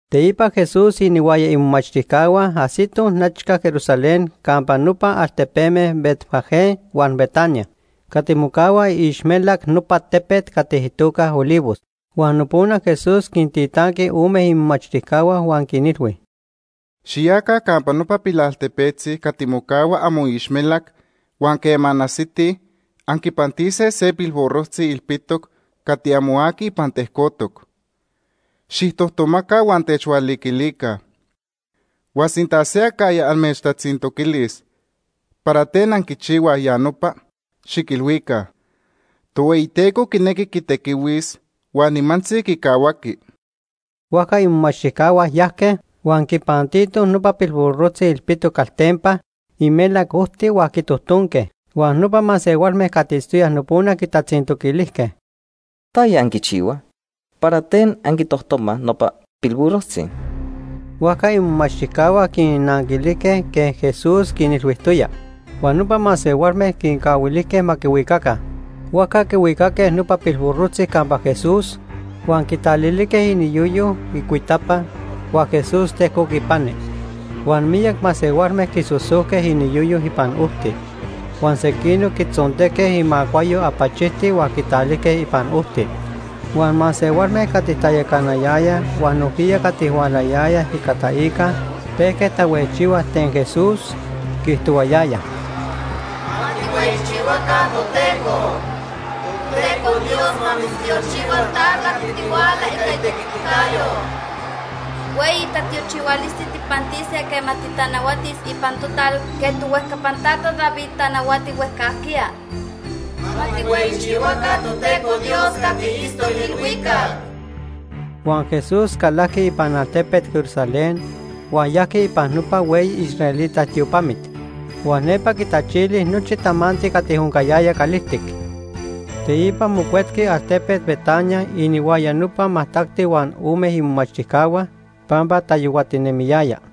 Teipa Jesús inihuaya imomachtijcahua ajsitoj nechca Jerusalén campa nopa altepeme Betfagé huan Betania, cati mocahua iixmelac nopa tepet cati itoca Olivos. Huan nopona Jesús quintitanqui ome imomachtijcahua, huan quinilhui: ―Xiyaca campa nopa pilaltepetzi cati mocahua amoixmelac huan quema anajsitij, anquipantise se pilburrojtzi ilpitoc, cati amo aqui ipan tejcotoc. Xijtojtomaca huan techhualiquilica. Huan sinta se acajya amechtatzintoquilis para ten anquichihuaj ya nopa, xiquilhuica: ‘Tohueyiteco quinequi quitequihuis huan nimantzi quicahuaqui.’ Huajca imomachtijcahua yajque huan quipantitoj nopa pilburrojtzi ilpitoc caltempa imelac ojti huan quitojtonque. Huan nopa masehualme cati itztoyaj nopona quintatzintoquilijque: ―¿Taya anquichihuaj? ¿Para ten anquitojtomaj nopa pilburrojtzi? Huajca imomachtijcahua quinnanquilijque quej Jesús quinilhuijtoya. Huan nopa masehualme quincahuilijque ma quihuicaca. Huajca quihuicaque nopa pilburrojtzi campa Jesús huan quitalilijque iniyoyo icuitapa, huan Jesús tejcoc ipani. Huan miyac masehualme quisosojque iniyoyo ipan ojti, huan sequinoc quitzontejque imacuayo apachijti huan quitalijque ipan ojti. Huan masehualme cati tayacanayayaj huan nojquiya cati hualayayaj ica taica pejque tahuejchihuaj ten Jesús, quiijtohuayayaj: ―¡Ma tijhueyichihuaca Toteco! Toteco Dios ma mitztiochihua ta cati tihuala ica itequiticayo. Hueyi tatiochihualisti tijpantise quema titanahuatis ipan total quej tohuejcapan tata David tanahuati huejcajquiya. ¡Ma tijhueyichihuaca Toteco Dios cati itztoc ilhuicac! Huan Jesús calajqui ipan altepet Jerusalén huan yajqui ipan nopa hueyi israelita tiopamit. Huan nepa quitachili nochi tamanti cati oncayaya calijtic. Teipa mocuetqui altepet Betania inihuaya nopa majtacti huan ome imomachtijcahua, pampa tayohuatinemiyaya.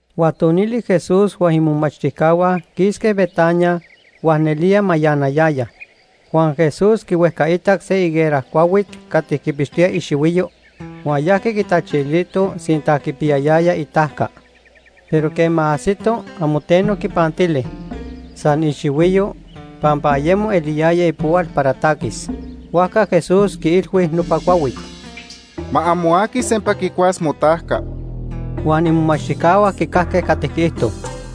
Huan tonili Jesús huan imomachtijcahua quisque Betania, huan nelía mayanayayaj. Huan Jesús quihuejcaitac se higuera cuahuit cati quipixtoya ixihuiyo, huan yajqui quitachilito sinta quipiyayaya itajca. Pero quema ajsito, amo teno quipantili, san ixihuiyo, pampa ayemo eliyaya ipohual para taquis. Huajca Jesús quiilhui nopa cuahuit: ―Ma amo aqui sempa quicuas motajca. Huan imomachtijcahua quicajque cati quiijto.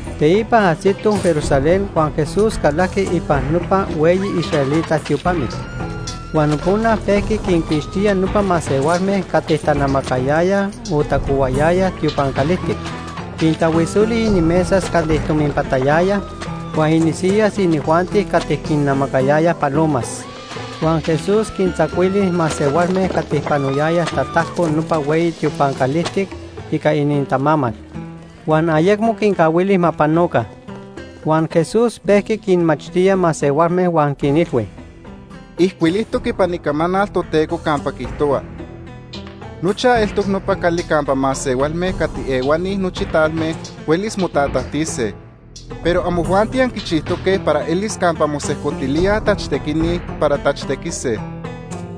Teipa ajsitoj Jerusalén huan Jesús calajqui ipan nopa hueyi israelita tiopamit. Huan nopona pejqui quinquixtía nopa masehualme cati tanamacayayaj o tacohuayayaj tiopan calijtic. Quintahuisoli inimesas cati tominpatayayaj huan inisiyas inijuanti cati quinnamacayayaj palomas. Huan Jesús quintzacuili masehualme cati panoyayaj tatajco nopa hueyi tiopan calijtic ica inintamamal, huan ayecmo quincahuili ma panoca. Huan Jesús pejqui quinmachtía masehualme huan quinilhui: ―Ijcuilijtoc ipan Icamanal Toteco campa quiijtohua: ‘Nochaj eltoc nopa cali campa masehualme cati ehuani nochi talme huelis motatajtise’, pero amojuanti anquichijtoque para elis campa mosejcotilíaj tachtequini para tachtequise.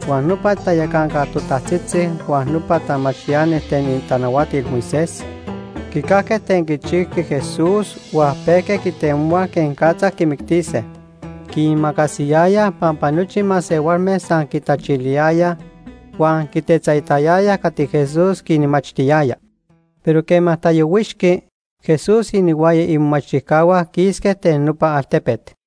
Huan nopa tayacanca totajtzitzi huan nopa tamachtiani ten itanahuatil Moisés quicajque ten quichijqui Jesús huan pejque quitemohuaj quenicatza quimictise. Quiimacasiyayaj pampa nochi masehualme san quitachiliyayaj huan quitetzaitayayaj cati Jesús quinmachtiyaya. Pero quema tayohuixqui, Jesús inihuaya imomachtijcahua quisque ten nopa altepet.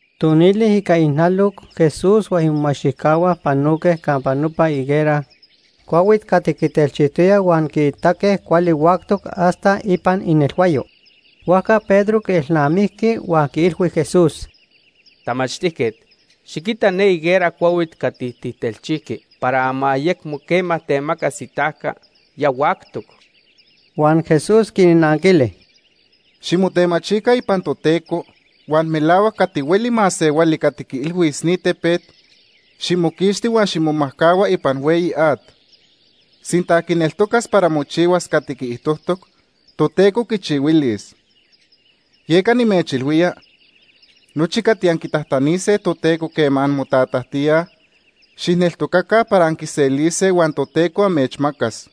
Tonili ica ijnaloc Jesús huan imomachtijcahua panoque campa nopa higuera cuahuit cati quitelchijtoya huan quiitaque cuali huactoc hasta ipan inelhuayo. Huajca Pedro quielnamijqui huan quiilhui Jesús: ―Tamachtijquet, xiquita ne higuera cuahuit cati tijtelchijqui para ma ayecmo quema temacas itajca, ya huactoc. Huan Jesús quinnanquili: ―Ximotemachica ipan Toteco, huan melahuac, cati hueli masehuali cati quiilhuis ni tepet: ‘Ximoquixti huan ximomajcahua ipan hueyi at’, sinta quineltocas para mochihuas cati quiijtojtoc, Toteco quichihuilis. Yeca nimechilhuía, nochi cati anquitajtanise Toteco quema anmotatajtíaj, xijneltocaca para anquiselise huan Toteco amechmacas.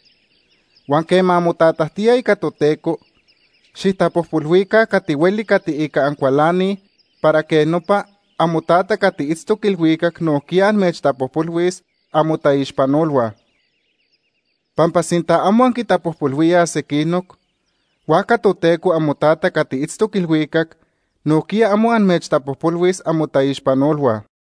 Huan quema anmotatajtíaj ica Toteco, xijtapojpolhuica cati hueli cati ica ancualanij para quej nopa amoTata cati itztoc ilhuicac nojquiya amechtapojpolhuis amotaixpanolhua. Pampa sinta amo anquintapojpolhuíaj sequinoc, huajca Toteco amoTata cati itztoc ilhuicac nojquiya amo amechtapojpolhuis amotaixpanolhua.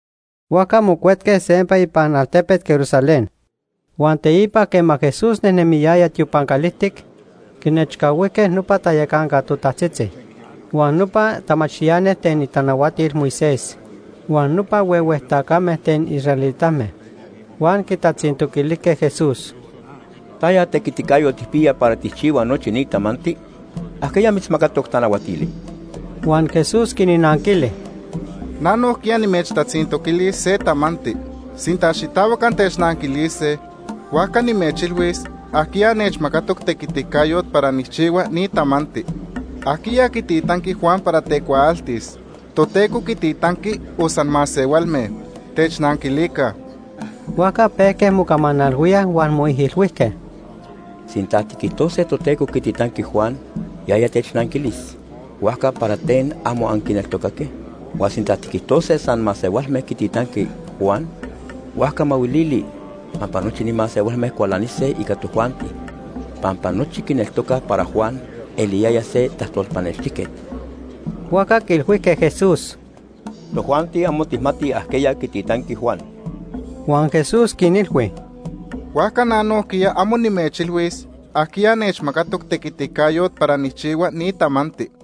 Huajca mocuetque sempa ipan altepet Jerusalén. Huan teipa quema Jesús nejnemiyaya tiopan calijtic, quinechcahuijque nopa tayacanca totajtzitzi, huan nopa tamachtiani ten itanahuatil Moisés, huan nopa huehue tacame ten israelitame. Huan quitatzintoquilijque Jesús: ―¿Taya tequiticayot tijpiya para tijchihua nochi ni tamanti? ¿Ajquiya mitzmacatoc tanahuatili? Huan Jesús quinnanquili: ―Na nojquiya nimechtatzintoquilis se tamanti. Sinta xitahuac antechnanquilise, huajca nimechilhuis ajquiya nechmacatoc tequiticayot para nijchihua ni tamanti. ¿Ajquiya quititanqui Juan para tecuaaltis? ¿Toteco quititanqui o san masehualme? Technanquilica. Huajca pejque mocamanalhuíaj huan moijilhuijque: ―Sinta tiquijtose Toteco quititanqui Juan, yaya technanquilis: ‘Huajca, ¿para ten amo anquineltocaque?’ Huan sinta tiquijtose san masehualme quititanque Juan, huajca mahuilili, pampa nochi ni masehualme cualanise ica tojuanti, pampa nochi quineltocaj para Juan eliyaya se tajtolpanextijquet. Huajca quiilhuijque Jesús: ―Tojuanti amo tijmatij ajquiya quititanqui Juan. Huan Jesús quinilhui: ―Huajca na nojquiya amo nimechilhuis ajquiya nechmacatoc tequiticayot para nijchihua ni tamanti.